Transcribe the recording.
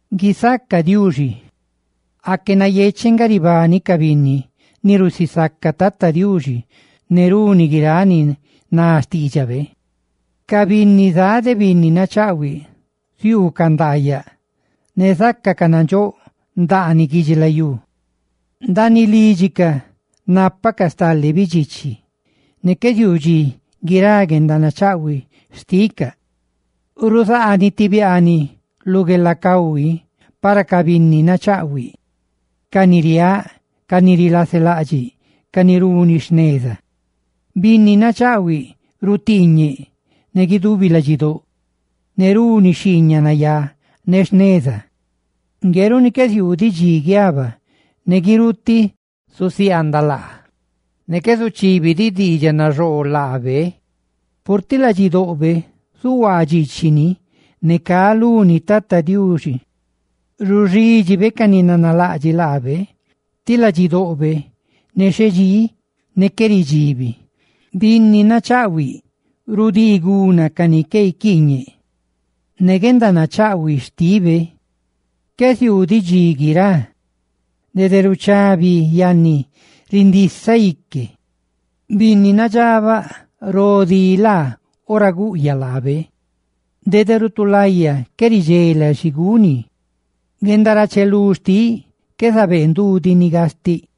¡Guisaca Diuxi! Aque nayecheꞌ nga ribani ca binni ni rusisaca Tata Diuxi ne runi guiráꞌ ni ná xtiidxabe. Ca binni zá de binni nachaꞌhuiꞌ ziuucaꞌ ndaayaꞌ ne zácacaꞌ nandxóꞌ ndaaniꞌ guidxilayú riꞌ. Ndaaniꞌ lídxicaꞌ nápacaꞌ stale bidxichi, ne qué ziuu dxi guirá guendanachaꞌhuiꞌ xticaꞌ. Ruzaaniꞌ ti biaaniꞌ lu guelacahui para ca binni nachaꞌhuiꞌ, ca ni riáꞌ, ca ni rilaselaꞌdxiꞌ, ca ni runi jneza. Binni nachaꞌhuiꞌ rutiiñeꞌ ne guidubi ladxidóꞌ ne runi xhiiñaꞌ nayá ne jneza; ngue runi qué ziuu diꞌ dxi guiaba. ¡Ne guirutiꞌ zusiaandaꞌ laa! Ne qué zuchibi diꞌ diidxaꞌ naxoo laabe; purtiꞌ ladxidoꞌbe zuhuaa dxiichiꞌ, ne cá luni Tata Diuxi. Ruxidxibe ca ni nanalaꞌdxiꞌ laabe, tí ladxidoꞌbe nexhedxí, ne qué ridxibi. Binni nachaꞌhuiꞌ rudii guna ca ni caquiiñeꞌ ni, guendanachaꞌhuiꞌ xtibe qué ziuu diꞌ dxi guirá, ne nadxóꞌ rindisaꞌ ique. Binni nadxabaꞌ ro dí laa ora guꞌyaꞌ laabe; dede rutulaya qué ridxela xi guni. Guendarachelú xtiꞌ qué zabee ndu ni gastiꞌ.